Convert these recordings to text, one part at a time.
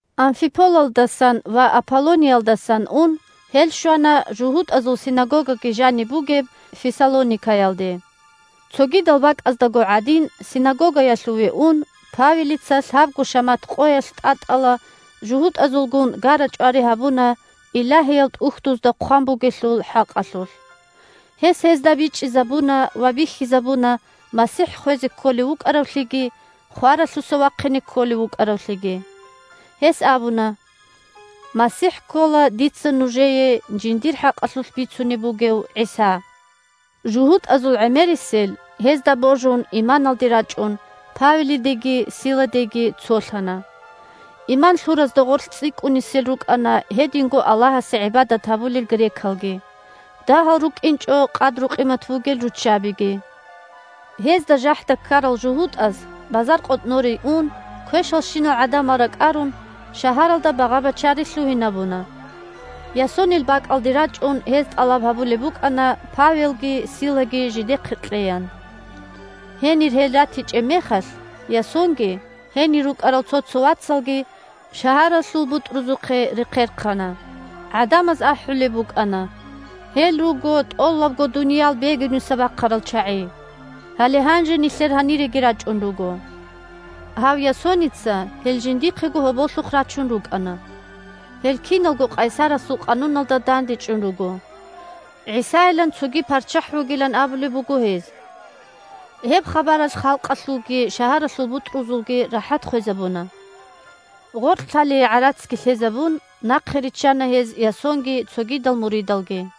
Амфиполалдасан ва Аполлониялдасан ун гьел щвана жугьутӀазул синагогаги жаниб бугеб Фессалоникаялде. Цогидал бакӀаздаго гӀадин, синагогаялъуве ун, Павелица лъабго шамат къоялъ тӀатӀала жугьутӀазулгун гара-чӀвари гьабуна Илагьиял ТӀухьдузда хъван бугелъул хӀакъалъулъ. Гьес гьезда бичӀчӀизабуна ва бихьизабуна МасихӀ хвезе кколев вукӀаравлъиги хваралъуса вахъине кколев вукӀаравлъиги. Гьес абуна: – МасихӀ ккола дица нужее жиндир хӀакъалъулъ бицунеб бугев ГӀиса. ЖугьутӀазул гӀемерисел, гьезда божун иманалде рачӀун, Павелидеги Силадеги цолъана. Иман лъуразда гъорлъ цӀикӀкӀунисел рукӀана гьединго Аллагьасе гӀибадат гьабулел грекалги, дагьал рукӀинчӀо къадру-къимат бугел руччабиги. Гьезда жахӀда ккарал жугьутӀаз, базаркъотӀноре ун квешалщинал гӀадамал ракӀарун, шагьаралда багъа-бачари лъугьинабуна. Ясонил бакӀалде рачӀун гьез тӀалаб гьабулеб букӀана Павелги Силаги жидехъе кьеян. Гьенир гьел ратичӀеб мехалъ, Ясонги гьенир рукӀарал цо-цо вацалги шагьаралъул бутӀрузухъе рехъерхъана. ГӀадамаз ахӀулеб букӀана: – Гьел руго тӀолабго дуниял бегуниса бахъарал чагӀи! Гьале гьанже нилъер гьаниреги рачӀун руго. Гьав Ясоница гьел жиндихъего гьоболлъухъ рачун рукӀана. Гьел киналго къайсарасул къануналда дандечӀун руго. ГӀисайилан цоги парччахӀ вугилан абулеб буго гьез! Гьеб хабаралъ халкъалъулги шагьаралъул бутӀрузулги рахӀат хвезабуна. Гъоркьлъалие гӀарацги лъезабун, нахъе риччана гьез Ясонги цогидал муридалги.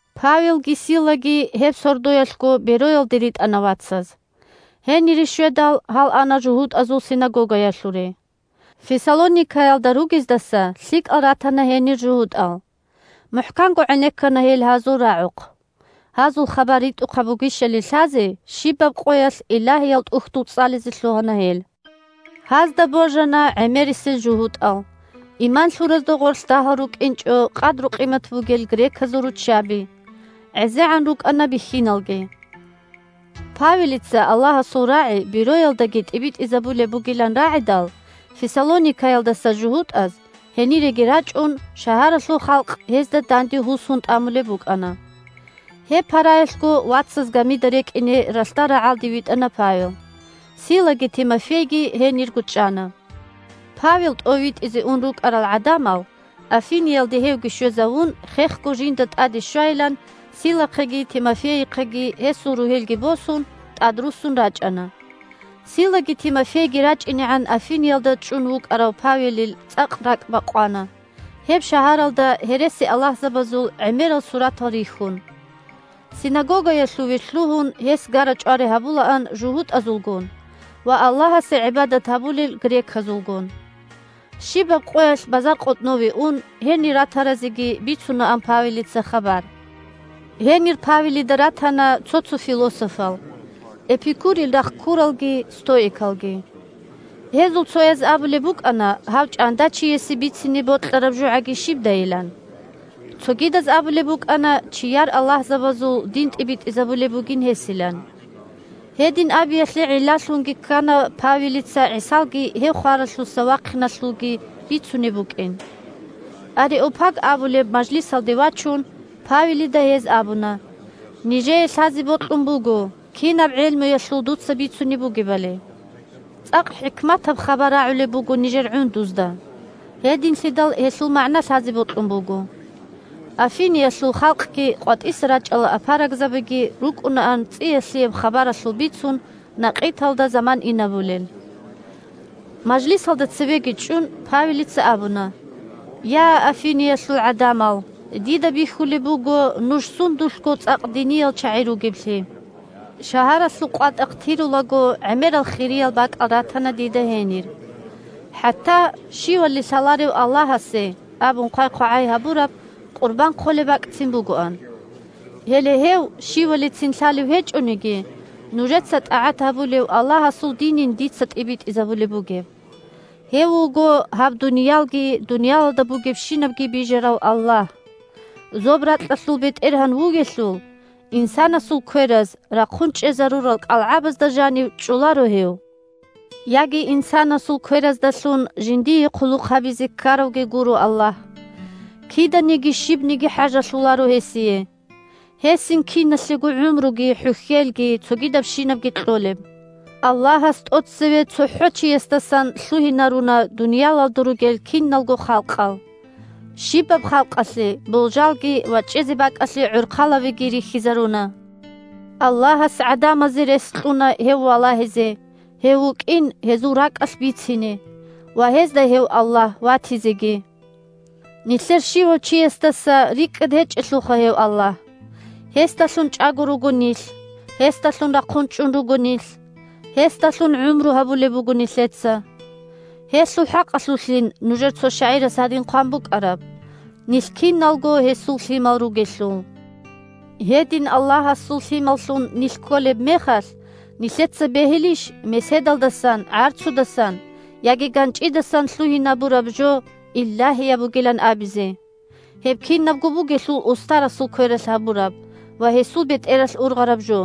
Павелги Силаги гьеб сордоялъго Бероялде ритӀана вацаз. Гьенире щведал гьал ана жугьутӀазул синагогаялъуре. Фессалоникаялда ругездаса лъикӀал ратана гьенир жугьутӀал. МухӀканго гӀенеккана гьел гьазул рагӀухъ. Гьазул хабар ритӀухъаб бугищали лъазе щибаб къоялъ Илагьиял ТӀухьдул цӀализе лъугьана гьел. Гьазда божана гӀемерисел жугьутӀал, иман лъуразда гъорлъ дагьал рукӀинчӀо къадру-къимат бугел греказул руччаби, гӀезегӀан рукӀана бихьиналги. Павелица Аллагьасул рагӀи Бероялдаги тӀибитӀизабулеб бугилан рагӀидал, Фессалоникаялдаса жугьутӀаз, гьениреги рачӀун, шагьаралъул халкъ гьезда данде гьусун тӀамулеб букӀана. Гьеб параялъго вацаз гамида рекӀине ралъдал рагӀалде витӀана Павел. Силаги Тимофейги гьенирго чӀана. Павел тӀовитӀизе ун рукӀарал гӀадамал, Афиниялде гьевги щвезавун, хехго жинда тӀаде щвайилан Силахъеги Тимофейихъеги гьесул ругьелги босун, тӀадруссун рачӀана. Силаги Тимофейги рачӀинегӀан Афиниялда чӀун вукӀарав Павелил цӀакъ ракӀ бакъвана гьеб шагьаралда гьересиаллагьзабазул гӀемерал суратал рихьун. Синагогаялъуве лъугьун гьес гара-чӀвари гьабулаан жугьутӀазулгун ва Аллагьасе гӀибадат гьабулел греказулгун. Щибаб къоялъ базаркъотӀнове ун, гьенир ратаразеги бицунаан Павелица хабар. Гьенир Павелида ратана цо-цо философал – Эпикурил рахъ ккуралги стоикалги. Гьезул цояз абулеб букӀана гьав чӀандачиясе бицине бокьараб жогӀаги щибдайилан. Цогидаз абулеб букӀана чияр аллагьзабазул дин тӀибитӀизабулеб бугин гьесилан. Гьедин абиялъе гӀиллалъунги ккана Павелица ГӀисалги гьев хваралъуса вахъиналъулги бицунеб букӀин. Ареопаг абулеб мажлисалде вачун, Павелида гьез абуна: – Нижее лъазе бокьун буго кинаб гӀелмуялъул дуца бицунеб бугебали. ЦӀакъ хӀикматаб хабар рагӀулеб буго нижер гӀундузда, гьединлъидал гьелъул магӀна лъазе бокьун буго. (Афиниялъул халкъги къватӀиса рачӀарал апарагзабиги рукӀунаан цӀия-лъияб хабаралъул бицун накъиталда заман инабулел.) Мажлисалда цевеги чӀун, Павелица абуна: – Я, Афиниялъул гӀадамал, дида бихьулеб буго нуж сундулъго цӀакъ диниял чагӀи ругеблъи. Шагьаралъул къватӀахъ тирулаго гӀемерал хириял бакӀал ратана дида гьенир. ХӀатта, «Щивали лъаларев аллагьасе» абун хъвай-хъвагӀай гьабураб къурбан хъолеб бакӀцин бугоан. Гьеле гьев, щивалицин лъалев гьечӀониги, нужеца тӀагӀат гьабулев Аллагьасул динин дица тӀибитӀизабулеб бугеб. Гьев вуго гьаб дуниялги дуниялалда бугебщинабги бижарав Аллагь. Зоб-ракьалъул БетӀергьан вугелъул, инсанасул квераз рахъун чӀезарурал кӀалгӀабазда жанив чӀоларо гьев. Яги инсанасул квераздалъун жиндие хъулухъ гьабизе ккаравги гуро Аллагь. Киданиги щибниги хӀажалъуларо гьесие. Гьесин киналъего гӀумруги, хӀухьелги, цогидабщинабги кьолеб. Аллагьас тӀоцеве цохӀо чиясдасан лъугьинаруна дуниялалда ругел киналго халкъал. Щибаб халкъалъе болжалги ва чӀезе бакӀалъе гӀорхъалабиги рихьизаруна. Аллагьас гӀадамазе рес кьуна гьев валагьизе, гьев вукӀин гьезул ракӀалъ бицине ва гьезда гьев Аллагь ватизеги. Нилъер щивав чиясдаса рикӀкӀад гьечӀелъулха гьев Аллагь. Гьесдалъун чӀаго руго нилъ, гьесдалъун рахъун чӀун руго нилъ, гьесдалъун гӀумру гьабулеб буго нилъеца. Гьелъул хӀакъалъулъин нужер цо шагӀирас гьадин хъван букӀараб: «Нилъ киналго Гьесул Лъимал ругелъул…» Гьедин Аллагьасул лъималлъун нилъ кколеб мехалъ, нилъеца бегьилищ меседалдасан, гӀарцудасан, яги ганчӀидасан лъугьинабураб жо илагьияб бугилан абизе, гьеб кинабго бугелъул устарасул квералъ гьабураб ва гьесул бетӀералъ ургъараб жо.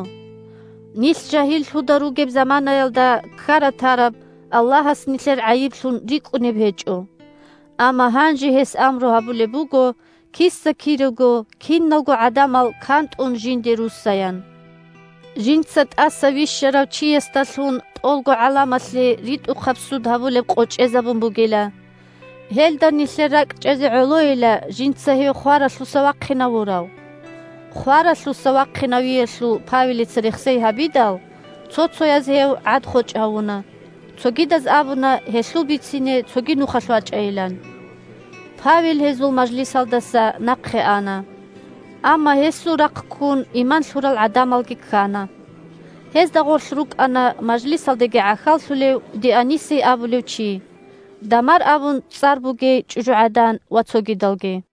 Нилъ жагьиллъуда ругеб заманаялда ккара-тараб Аллагьас нилъер гӀайиблъун рикӀкӀунеб гьечӀо. Амма гьанже гьес амру гьабулеб буго киса-кирего киналго гӀадамал кантӀун жинде руссаян. Жинца тӀаса вищарав Чиясдалъун тӀолго гӀаламалъе ритӀухъаб суд гьабулеб къо чӀезабун бугила. Гьелда нилъер ракӀчӀезе гӀолойила жинца гьев хваралъуса вахъинавурав. Хваралъуса вахъинавиялъул Павелица рехсей гьабидал, цо-цояз гьев гӀад-хочӀ гьавуна, цогидаз абуна гьелъул бицине цоги нухалъ вачӀайилан. Павел гьезул мажлисалдаса нахъе ана. Амма гьесул рахъ ккун иман лъурал гӀадамалги ккана. Гьезда гъорлъ рукӀана мажлисалдаги гӀахьаллъулев Дионисий абулев чи, Дамар абун цӀар бугей чӀужугӀадан ва цогидалги.